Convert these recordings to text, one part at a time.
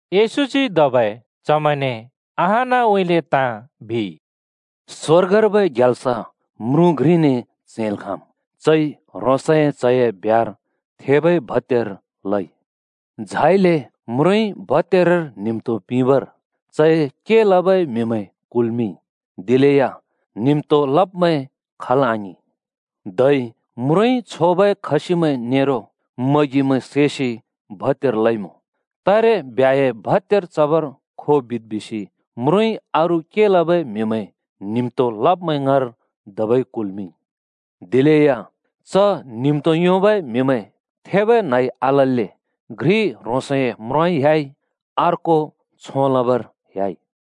येशूजी धबै चमैंने अहानउँइँले ताँ बिइ। “स्‍वर्गर्बै ग्याल्स म्रुँ घ्रिने च्हैंल् खाँम्। चइ ह्रोंसए च्‍हए ब्ह्‍यार थेबै भत्‍यार लइ। झाइले म्रुँइ भत्यारर न्हिम्‍तो पिंबर चए के लबै म्‍हिमैं कुल्‍मिंइ। दिलेया न्हिम्तो लब्मैं खल् आङिं। “धै म्रुँइ छोबै खसिमैं नेरो मगिमैं सैसि भत्यार लइमुँ। तारे ब्ह्‍याए भत्‍यार चबर खो बिद् बिसि म्रुँइ अरू के लबै म्‍हिमैं न्हिम्‍तो लब्‍मैं ङाँर धबै कुल्मिंइ। दिलेया च न्हिम्‍तो लबै म्हिमैं थेबै न्हइ आलल्‍ले घ्रि ह्रोंसए म्रोंउँइँ ह्‍याइ, अर्को छों लबर ह्‍याइ।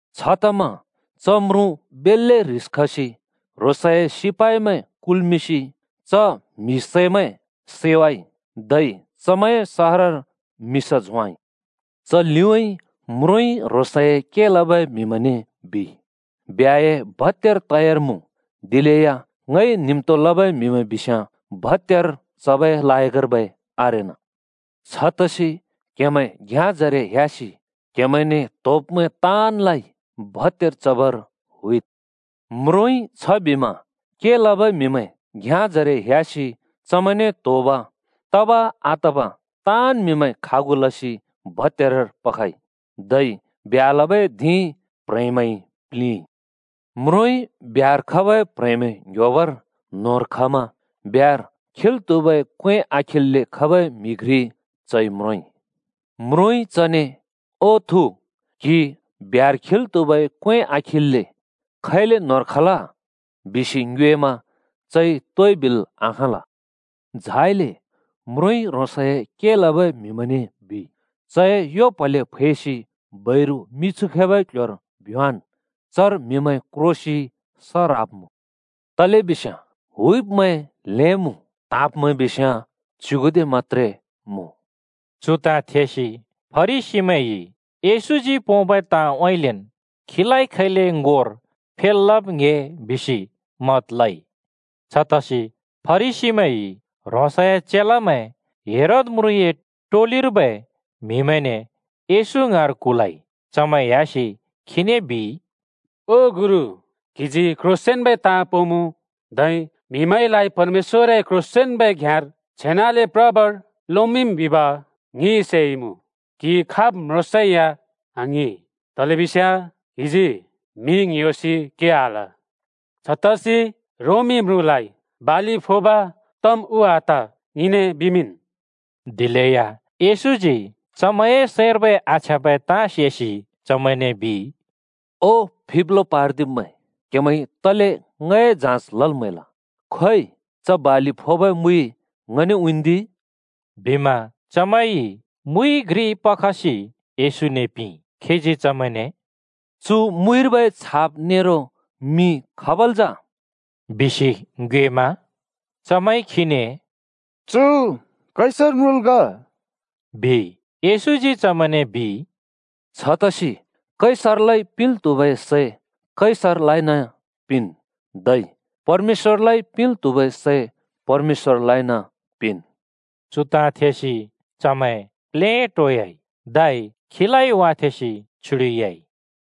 छतमा च म्रुँ बेल्‍ले ह्रिस खसि ह्रोंसए सिपाइमैं कुल्‍मिंसि च म्हि सैमैं सैवाइ, धै चमैंए सहरर मिसा झोंवाइ। “च लिउँइँ म्रुँइ ह्रोंसए के लबै म्‍हिमैंने बिइ, ‘ब्ह्‍याए भत्‍यार तयार मुँ, दिलेया ङइ न्हिम्‍तो लबै म्‍हिमैं बिस्‍याँ भत्‍यार चबै लायकर्बै आरेना। छतसि क्‍हेमैं घ्याँजरे ह्‍यासि क्हेमैंने त्‍होब्मैं ताँनलाइ भत्‍यार चबर हुइद्।’ म्रुँइ छबिमा के लबै म्‍हिमैं घ्याँजरे ह्‍यासि चमैंने त्‍होब तब-आतब ताँन् म्हिमैं खागु लसि भत्यारर पखइ। धै ब्ह्‍या लबै धिं प्ह्रेंमैंइ प्‍लिंइ। “म्रुँइ ब्ह्‍यार खबै प्‍ह्रेंमैं ङ्‌ह्‍योबर न्होंर खमा, ब्ह्‍यार खिल् त्‍हुबै क्‍वें आखिल्‍‍ले खबै म्हि घ्रि चइ म्रोंइ। म्रुँइ चने ‘ओ थु, क्‍हि ब्ह्‍यार खिल् त्‍हुबै क्‍वें आ‍खिल्‍ले खैले न्‍होंर खल?’ बिसि ङ्योएमा चइ तोइ बिल् आखाँल। झाइले म्रुँइ ह्रोंसए के लबै म्‍हिमैंने बिइ, ‘चए यो प्‍हले फैसि बैरु मिछु खैबै क्‍ल्‍ह्‍योर भ्‍योंवाँन्, चर म्‍हिमैं क्रोसि स ह्राब्‍मुँ।’ “तलेबिस्याँ हुइब्मैं ल्‍हें मुँ, त्हाँब्मैं बिस्याँ च्‍युगुदे मत्‍त्रे मुँ।” चु ताँ थेसि फरिसीमैंइ येशूजी पोंबै ताँउँइँलेन् खीलाइ खैले ङोर फेल् लब् ङ्‍हे बिसि मत लइ। छतसि फरिसीमैंइ ह्रोंसए चेलामैं हेरोद म्रुँए टोलिर्बै म्हिमैंने येशू ङाँर कुलइ। चमैं ह्‍यासि खीने बिइ, “ओ गुरु, क्‍हिजी क्‍ह्रोंसेंन्‍बै ताँ पोंमुँ, धै म्‍हिमैंलाइ परमेश्‍वरए क्ह्रोंसेंन्बै घ्‍याँर छेनाले प्रबर लोमिंम् बिब ङिइ सेइमुँ। क्‍हि खाब् म्रोंसेया आङ्हिं, तलेबिस्याँ क्हिजी म्‍हि ङ्‍ह्‍योसि के आल। छतसि रोमी म्रुँलाइ बालि फोब तम् उ आत? ङिने बिमिंन्।” दिलेया येशूजी चमैंए सैंर्बै आछ्याँबै ताँ सेसि चमैंने बिइ, “ओ फिब्लो पार्दिब्मैं, क्‍हेमैंइ तले ङए जाँच लल् म्‍हैल? खोइ, च बालि फोबै मुइ ङने उँइँन्दि।” बिमा चमैंइ मुइ घ्रि पखसि येशूने पिंइ। खीजी चमैंने “चु मुइर्बै छाप नेरो मिं खाबल् जा?” बिसि ङ्योएमा चमैंइ खीने “चु कैसर म्रुँल् ग,” बिइ। येशूजी चमैंने बिइ, “छतसि कैसरलाइ पिंल् त्हुबै सै कैसरलाइन पिंन्, धै परमेश्‍वरलाइ पिंल् त्हुबै सै परमेश्‍वरलाइन पिंन्।” चु ताँ थेसि चमैं प्लेटोयाइ, धै खीलाइ वाथेंसि छ्युडिह्‍याइ।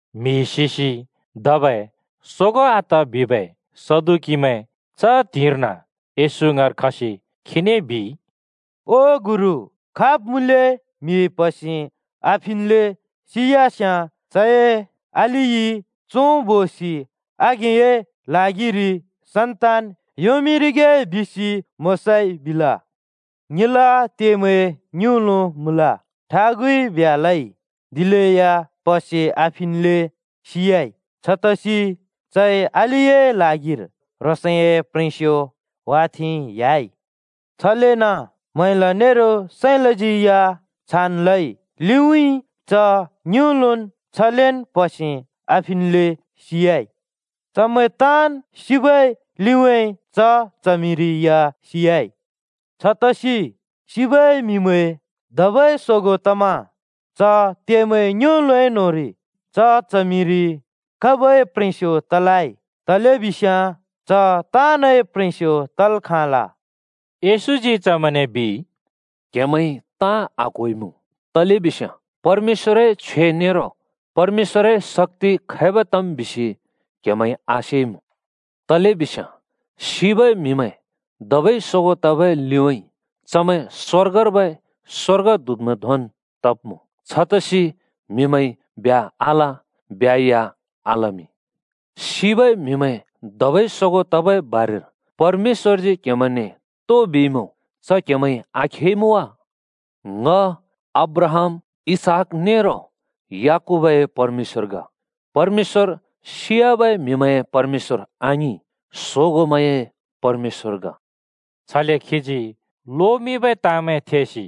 म्हि सिसि धबै सोगों आत बिबै सदुकीमैं च त्हिंइर्न येशू ङाँर खसि खीने बिइ, “ओ गुरु, खाब् मुँले म्‍हि प्हसे आफिन्‍ले सियास्‍याँ चए अलिइ चों बोसि आघेंए ल्हागिरि सन्‍तान योंमिंरिगे बिसि मोशाइ बिल। ङिला त्येमैं ङिउँलो मुँल। ठागुइ ब्ह्‍या लइ, दिलेया प्‍हसे आफिन्‍ले सियाइ। छतसि चइ अलिए ल्हागिर ह्रोंसए प्ह्रेंस्यो वाथेंइ ह्‍याइ। छलेन म्हैला नेरो साँइलाज्यै छान् लइ। लिउँइँ च ङिउँलोन् छलेन् प्‍हसे आफिन्‍लेन् सियाइ। चमैं ताँन् सिबै लिउँइँ च च्हमिरि या सियाइ। छतसि सिबै म्‍हिमैं धबै सोगों तमा च त्येमैं ङिउँलो न्‍होंरि च च्हमिरि खाबै प्ह्रेंस्यो तलै? तलेबिस्याँ च ताँनए प्ह्रेंस्यो तल् खाँल।” येशूजी चमैंने बिइ, “क्हेमैंइ ताँ आक्होइमुँ, तलेबिस्याँ परमेश्‍वरए छ्वे नेरो परमेश्‍वरए शक्‍ति खैब तम् बिसि क्‍हेमैंइ आसेइमुँ। तलेबिस्याँ सिबै म्‍हिमैं धबै सोगों तबै लिउँइँ चमैं स्‍वर्गर्बै स्‍वर्गदूतमैं धोंन् तब्‍मुँ। छतसि म्‍हिमैंइ ब्ह्‍या आल ब्ह्‍या या आलमिं। सिबै म्हिमैं धबै सोगों तबै बारेर परमेश्‍वरजी क्‍हेमैंने तो बिइमुँ, च क्‍हेमैंइ आखेइमुँ वा? ‘ङ अब्राहाम, इसहाक नेरो याकूबए परमेश्‍वर ग।’ परमेश्‍वर सियाबै म्‍हिमैंए परमेश्‍वर आङिं, सोगोंमैंए परमेश्‍वर ग।” छले खीजी लोमिंबै ताँमैं थेसि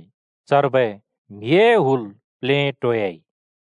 चर्बै म्‍हिए हुल प्लेटोयाइ।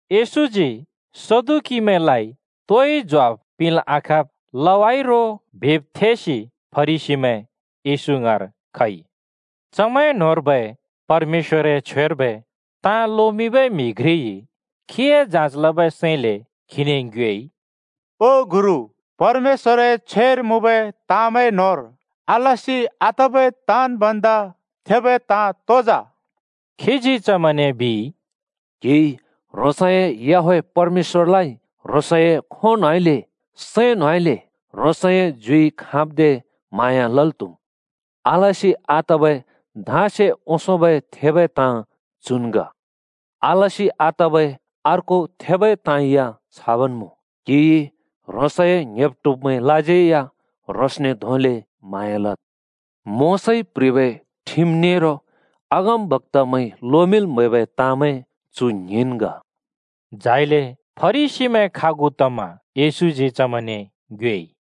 येशूजी सदुकीमैंलाइ तोइ ज्वाफ पिंल् आखाँब् लवाइ रो बिब् थेसि फरिसीमैं येशू ङाँर खइ। चमैं न्‍होंर्बै परमेश्‍वरए छ्वेर्बै ताँ लोमिंबै म्हि घ्रिइ खीए जाँच लबै सैंले खीने ङ्योएइ, “ओ गुरु, परमेश्‍वरए छ्वेर मुँबै ताँमैं न्होंर आलसि आतबै ताँन् भन्दा थेबै ताँ तो जा?” खीजी चमैंने बिइ, “‘क्‍हिइ ह्रोंसए याहवेह परमेश्‍वरलाइ ह्रोंसए खों न्होंइले, सैं न्होइले, ह्रोंसए ज्युइ खाँब्दे म्हाँया लल् त्‍हुम्।’ आलसि आतबै धाँसे ओंसोंबै थेबै ताँ चुन् ग। आलसि आतबै अर्को थेबै ताँ या छाबन् मुँ, ‘क्‍हिइ ह्रोंसए ङ्‍हेब्-ट्हुब्मैंलाज्यै या ह्रोंसने धोंले म्हाँया लद्।’ मोशाइ प्‍ह्रिबै ठिम नेरो अगमबक्‍तामैंइ लोमिंल् म्हैबै ताँमैं चु ङ्हिंन् ग।” झाइले फरिसीमैं खागु तमा येशूजी चमैंने ङ्योएइ,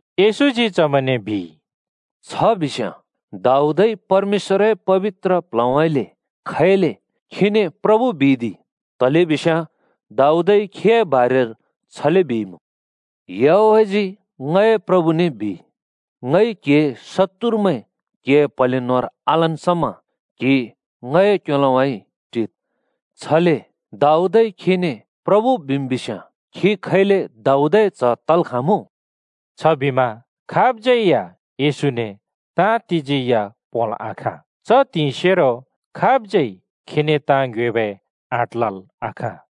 येशूजी चमैंने बिइ, “छ बिस्‍याँ दाऊदइ परमेश्‍वरए पबित्र प्ल्हउँइँले खैले खीने प्रभु बिइ दि? तलेबिस्याँ दाऊदइ खीए बारेर छले बिइमुँ: ‘याहवेहजी ङए प्रभुने बिइ, ङइ क्‍हिए शत्तुरमैं क्‍हिए प्‍हले न्‍होंर आलन् समा क्‍हि ङए क्‍योलोउँइँ टिद्।’ छले दाऊदइ खीने प्रभु बिम् बिस्याँ खी खैले दाऊदए च्ह तल् खाँमुँ?” छबिमा खाबज्यै या येशूने ताँ तिजी या पोंल् आखाँ। च त्हिंइसेरो खाबज्यै खीने ताँ ङ्योएबै आँट लल् आखाँ।